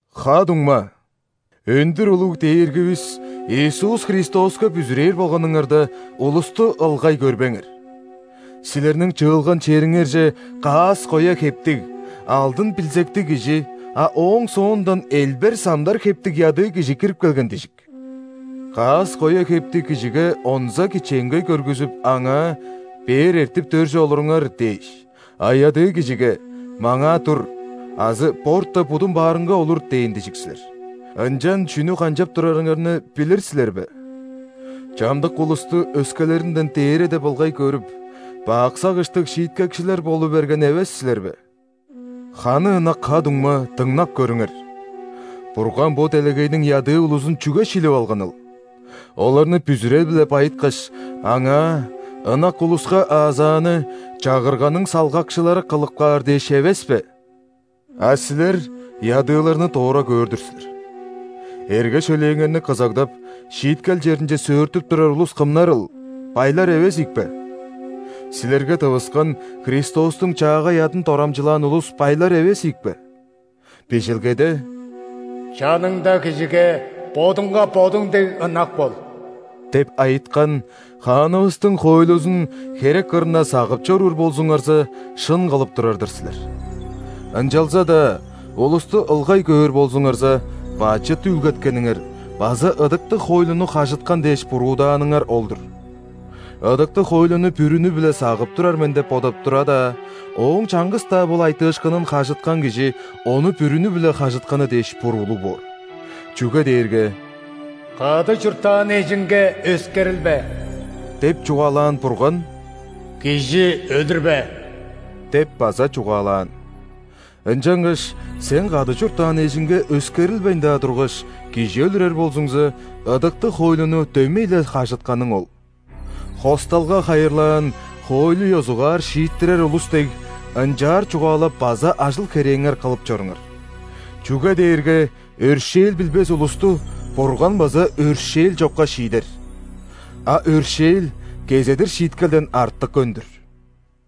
Ха-дуңма! Өндүр улуг Дээргивис Иисус Христоска бүзүрээр болганыңарда, улусту ылгай көрбеңер. Силерниң чыылган чериңерже каас-коя хептиг, алдын билзектиг кижи, а ооң соондан элбер-самдар хептиг ядыы кижи кирип келген дижик. Каас-коя хептиг кижиге онза кичээнгей көргүзүп, аңаа: «Бээр эртип, дөрже олуруңар» – дээш, а ядыы кижиге: «Маңаа тур» азы: «Борта, будум баарынга олур» – дээн дижик силер. Ынчан чүнү канчап турарыңарны билир силер бе? Чамдык улусту өскелеринден дээре деп ылгай көрүп, бак сагыштыг шииткекчилер болу берген эвес силер бе? Ханы ынак ха-дуңма, дыңнап көрүңер! Бурган бо делегейниң ядыы улузун чүге шилип алганыл? Оларны бүзүрел-биле байыткаш, Аңаа ынак улуска аазааны Чагырганың салгакчылары кылып каар дээш эвес бе? А силер ядыыларны дора көөр-дүр силер! Эрге-шөлээңерни кызагдап, шииткел черинче сөөртүп турар улус кымнарыл – байлар эвес ийик бе? Силерге тывыскан Христостуң чаагай адын дорамчылаан улус байлар эвес ийик бе? Бижилгеде: «Чаныңда кижиге бодуңга бодуң дег ынак бол» – деп айыткан Хаанывыстың хоойлузун херек кырында сагып чоруур болзуңарза, шын кылып турар-дыр силер. Ынчалза-даа улусту ылгай көөр болзуңарза, бачыт үүлгеткениңер база ыдыктыг хоойлуну хажыткан дээш буруудааныңар ол-дур. Ыдыктыг хоойлуну бүрүнү-биле сагып турар мен деп бодап тура-даа, ооң чаңгыс-даа бол айтыышкынын хажыткан кижи ону бүрүнү-биле хажытканы дээш буруулуг боор. Чүге дээрге: «Кады чурттаан эжиңге өскерилбе» – деп чугаалаан Бурган: «Кижи өлүрбе» – деп база чугаалаан. Ынчангаш сен кады чурттаан эжиңге өскерилбейн-даа тургаш, кижи өлүрер болзуңза, ыдыктыг хоойлуну дөмей-ле хажытканың ол. Хосталга хайырлаан хоойлу ёзугаар шииттирер улус дег, ынчаар чугаалап база ажыл-херээңер кылып чоруңар. Чүге дээрге өршээл билбес улусту Бурган база өршээл чокка шиидер. А өршээл кезедир шииткелден артык өндүр!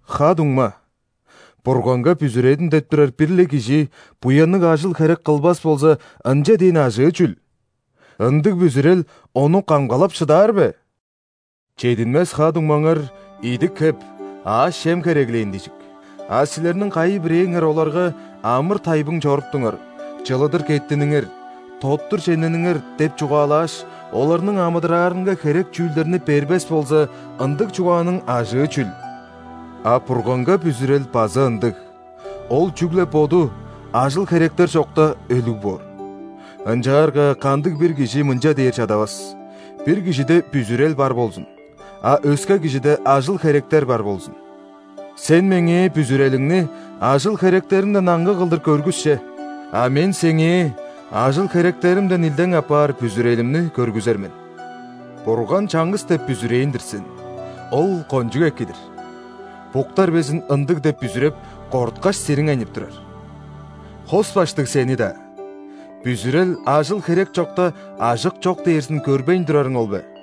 Ха-дуңма, Бурганга бүзүредим деп турар бир-ле кижи буянныг ажыл-херек кылбас болза, ынча дээн ажыы чүл? Ындыг бүзүрел ону камгалап шыдаар бе?! Чединмес ха-дуңмаңар идик-хеп, аъш-чем хереглээн дижик. А силерниң кайы-бирээңер оларга: «Амыр-тайбың чоруптуңар, чылыдыр кеттиниңер, тоттур чемнениңер» – деп чугаалааш, оларның амыдыраарынга херек чүүлдерни бербес болза, ындыг чугааның ажыы чүл? А Бурганга бүзүрел база ындыг – ол чүгле боду, ажыл-херектер чокта, өлүг боор. Ынчаарга кандыг-бир кижи мынча дээр чадавас: «Бир кижиде бүзүрел бар болзун, а өске кижиде ажыл-херектер бар болзун». Сен меңээ бүзүрелиңни ажыл-херектериңден аңгы кылдыр көргүс че. А мен сеңээ ажыл-херектеримден илдең апаар бүзүрелимни көргүзер мен. Бурган чаңгыс деп бүзүрээн-дир сен: ол кончуг эки-дир! Буктар безин ындыг деп бүзүреп, корткаш, сириңейнип турар. Хос баштыг сени-даа! Бүзүрел ажыл-херек чокта ажык чок дээрзин көрбейн турарың ол бе?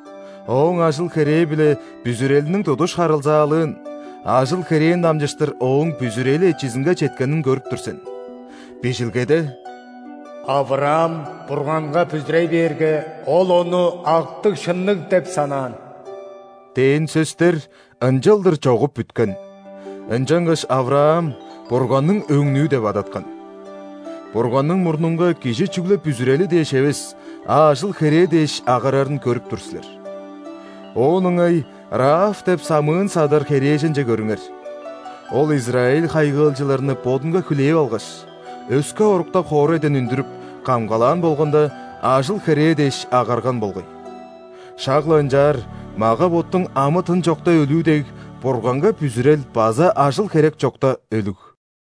Ооң ажыл-херээ биле бүзүрелиниң тудуш харылзаалыын, ажыл-херээн дамчыштыр ооң бүзүрели эчизинге четкенин көрүп тур сен. Бижилгеде: «Авраам Бурганга бүзүрей бээрге, Ол ону актыг-шынныг деп санаан» – дээн сөстер ынчалдыр чогуп бүткен, ынчангаш Авраам Бурганның өңнүү деп адаткан. Бурганның мурнунга кижи чүгле бүзүрели дээш эвес, а ажыл-херээ дээш агарарын көрүп тур силер. Оон ыңай Раав деп самыын-садар херээженче көрүңер. Ол израиль хайгыылчыларны бодунга хүлээп алгаш, өске оруктап хоорайдан үндүрүп, камгалаан болганда, ажыл-херээ дээш агарган болгай. Шак-ла ынчаар, мага-боттуң амы-тын чокта өлүү дег, Бурганга бүзүрел база ажыл-херек чокта өлүг.